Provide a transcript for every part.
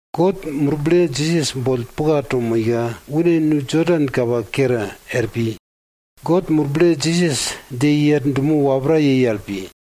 God Murble Jisas boll puka to moika, une nu Jodan kapa kere er pi. God Murble Jisas dje i er dumo wapra yei al pi.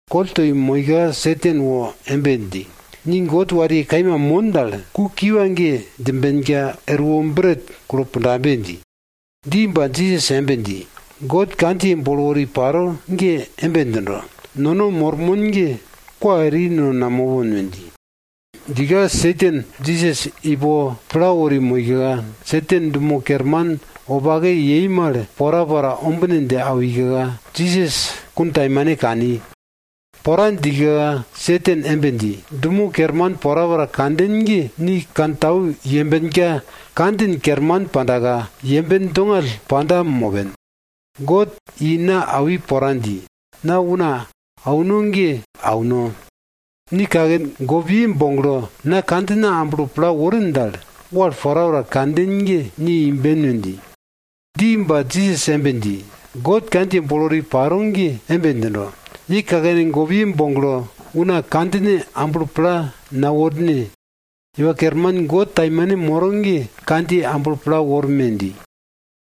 Koll toi moika Satan wo embe dji, ni God wariye kaima mon dal, ku kiwa ge djimbenka, erwo bret kulpundabe dji. Dji ba, Jisas embe dji, God kandjiye bolo wori paro ge embe djindo, nono mormon ge kwa eri no namopon we dji. Djika Satan Jisas ipo pla wori moika, Satan dumo kerman wopake yei mal porapora ombine dje awika, Jisas kuntaimane kani. Pora djika Satan embe dji, dumo kerman porapora kanden ge ni kantau yembenka kandjin kerman pandaka, yemben dongall panda mopen. God i na awi pora dji. Na una auno ge auno. Ni kaken gopiye boglo na kandjina amblo pla worin dal, wal porapora kanden ge ni imben we dji. Dji ba Jisas embe dji, God kandjiye bolo wori paro ge embe djindo, ye kakene gopiye boglo, una kandjine amblo pla naworne. Iwa Kerman God taimane moro ge kandjiye amblo pla worme! dji.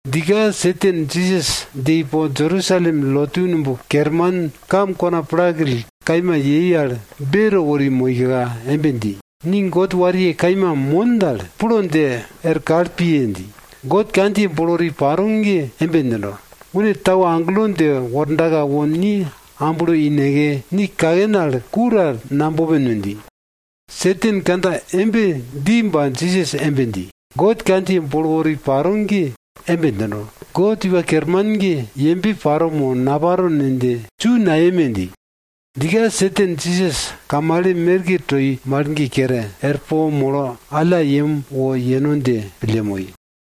Djika Satan Jisas dje ipo Jerusalem lotu numb kerman kam kona plakill kaima yei al beto wori moika, embe dji, ni God wariye kaima mon dal, plo dje er kal piye! dji. God kandjiye bolo wori paro ge embe djindo, une tau agelo dje wordaka wo ni amblo ineke ni kaken al ku ta nabopen we dji. Satan kandja embe dji ba Jisas embe dji, God kandjiye bolo wori paro ge embe djindo, God Iwa Kerman ge yembe paro mo naparo ne dje su nayeme! dji. Djika Satan Jisas kamale merke toi mal ge kere, er po molo alla yem wo yeno dje pille moi.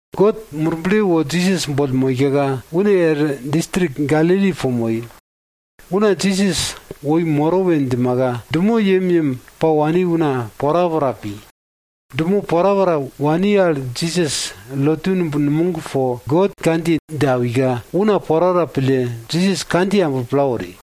God Murble wo Jisas boll moika, une er distrik Galili po moi. Una Jisas woi moro we djimaka dumo yemyem pa wani una porapora pi. Dumo porapora wani al Jisas lotu numb numog po God kandjiye dje awika, una porapora pille Jisas kandjiye amblo pla wori.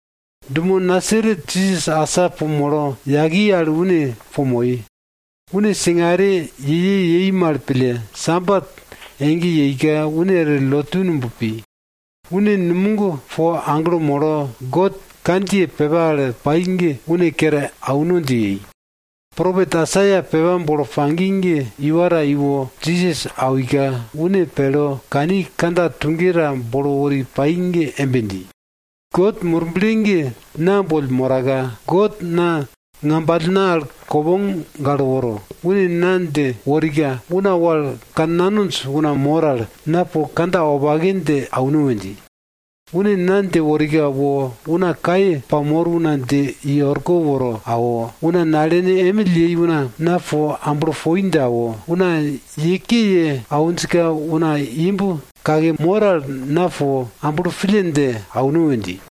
Dumo Nasaret Jisas asa po molo yaki al une po moi. Une singare ye ye yei mal pille Sabat ege yeika, une er lotu numb pi. Une numog po aglo molo, God kandjiye pepa al pai ge une kere auno dje yei, propet Aisaia pepa bolo pagi ge iwa ta iwo Jisas awika, une pelo kani kandja tuge ta bolo wori pai ge embe dji, God Murble ge na boll moraka, God na ngambalna al kopong galo woro, une na dje worika, una wal kannanonj una mor al, na po kandja wopake dje auno we dji. Une na dje worika wo una kaye pamor una dje i orko woro awo, una nalene emill yei una, na po amblo poi dje awo, una ye ke ye awinjka una imb kake mor al, na po amblo pille dje auno we dji.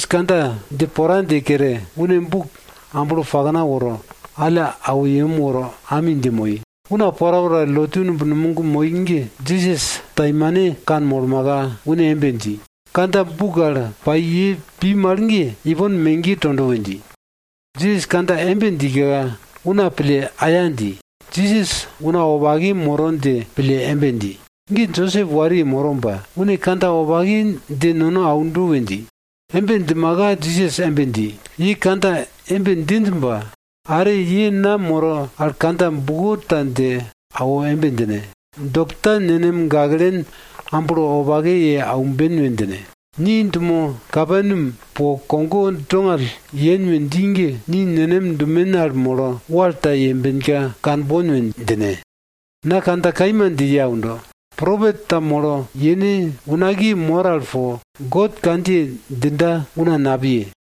Jisas kandja dje pora dje kere, une buk amblo pakna woro, alla awo yem woro ami dje moi. Una porapora lotu numb numog moi ge Jisas taimane kanmolmaka, une embe dji, kandja buk al pai ye pi mal ge, ipon megiye tondo we dji. Jisas kandja embe djika, una pille aya dji, Jisas una wopake moro dje pille embe dji, ge Josep wariye moro ba, une kandja wopake dje nono aundo we dji. Embe djimaka Jisas embe dji, ye kandja embe djinj ba, are ye na moro al kandja buko ta dje awo embe djine, dokta, nenem gaklen amblo wopake ye aumben we djine. Ni dumo Kaperneam po kogo dongall yen we dji ge, ni nenem dumen al molo wal ta yembenka kanbon we djine. Na kandja kaima dje ye aundo, propet ta molo yene unakiye mor al po, God kandjiye djinda, una napiye.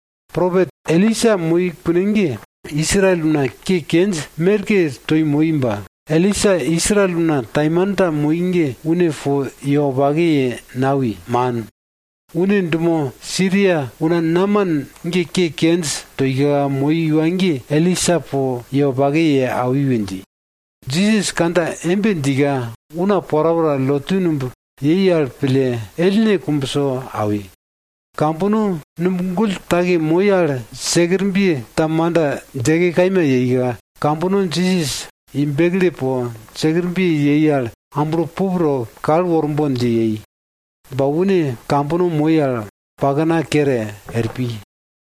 Propet Elisa moi kune ge, Israel una ke kenj merke toi moi ba, Elisa Israel una taimanta moi ge une po ye wopake ye nawi, man. Une dumo Siria una Naman ge ke kenj toika moi iwa ge, Elisa po ye wopake ye awi we dji. Jisas kandja embe djika una porapora lotu numb moi ge pille ellne kumbso awi. Kambono numb gull take moi al sekerbye ta manda djeke kaima yeika, kambono Jisas i bekle po sekerbye yei al amblo pup to kal worbon dje yei. Ba une kambono moi al pakna kere er pi.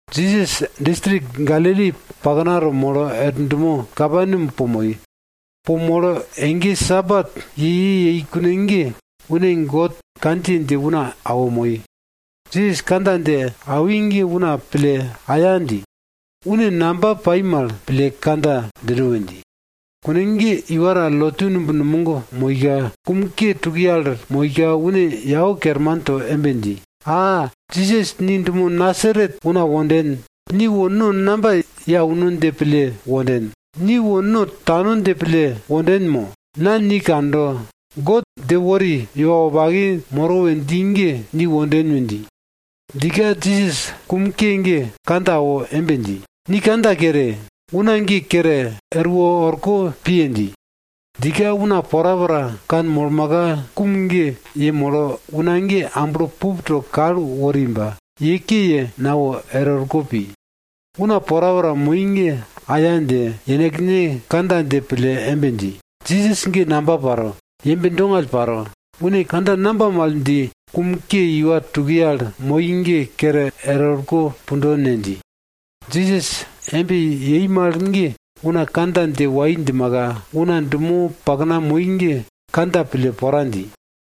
Jisas distrik Galili paknato molo er dumo Kaperneam po moi. Po molo Sabat ege ege yei kune ge une God kandjiye dje una awo moi. Jisas kandja dje awi ge una pille aya dji. Une namba pai mal pille kandja djindo we dji. Kune ge iwa ta lotu numb numog moika, kum ke tukiye al moika une yau kerman to embe dji, a! Jisas ni dumo Nasaret una wonden. Ni wo no namba ye auno dje pille wonden? Ni wo no tano dje pille wonden mo? Na ni kando. God dje wori iwa wopake moro we dji ge ni wale wonden we dji. Djika Jisas kum ke ge kandja awo embe dji, ni kandja kere! Una ge kere erwo orko piye! dji. Djika una porapora kanmolmaka, kum ge yemolo una ge amblo pup to kal wori ba, ye ke ye nawo er orko pi. Una porapora moi ge aya dje, yenekne kandja dje pille embe dji, Jisas ge namba paro, yembe dongall paro, une kandja namba mal dji, kum ke iwa tukiye al moi ge kere erwo orko pundo ne? dji. Jisas embe yei mal ge una kandja dje wai djimaka, una dumo pakna moi ge kandja pille pora dji.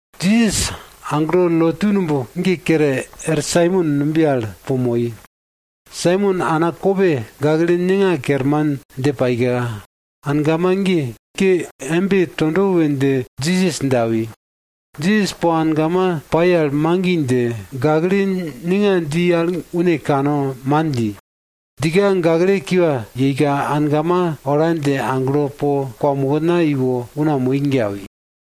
Jisas aglo lotu numb ge kere er Saimon numbiye al po moi. Saimon ana kope gakle ninga kerman dje paika, angama ge ke embe tondo we dje Jisas dje awi. Jisas po angama pai al magi dje, gakle ninga dji al une kane man dji. Djika, gakle kiwa yeika, angama ola dje aglo po kwamokna iwo una moi ge awi.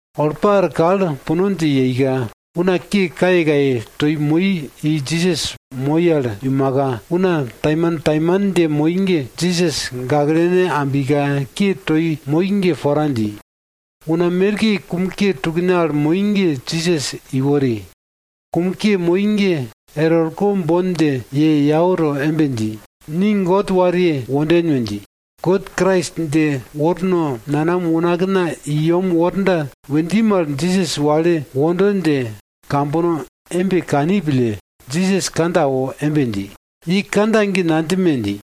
Olpa er kal puno dje yeika, una ke kayekaye toi moi i Jisas moi al iumaka, una taimantaiman dje moi ge, Jisas gaklene ambika ke toi moi ge pora dji. Una merke kum ke tukne al moi ge Jisas iwori. Kum ke moi ge er orko bon dje ye yau to embe dji, ni God wariye wonden we dji, God Krais dje worno wo nanam unakna i yem worda we dji mal, Jisas wale wondo dje kambono embe kani pille, Jisas kandja awo embe dji, ye kandja ge nadjime! dji.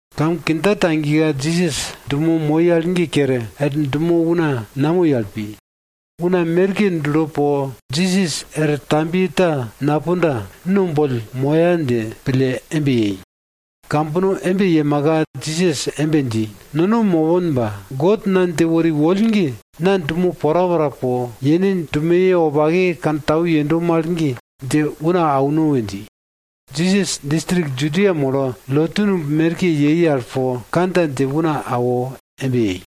Kam kindja tagika Jisas dumo moi al ge kere, er dumo una namoi al pi. Una merke dulo po, Jisas er tambiye ta napunda, no boll moya dje pille embe yei. Kambono embe yemaka Jisas embe dji, nono mopon ba, God na dje wori woll ge, na dumo porapora po, yene dumoye wopake kantau yendo mal ge, dje una auno we dji. Jisas distrik Judia molo, lotu numb merke yei al po kandja dje una awo embe yei.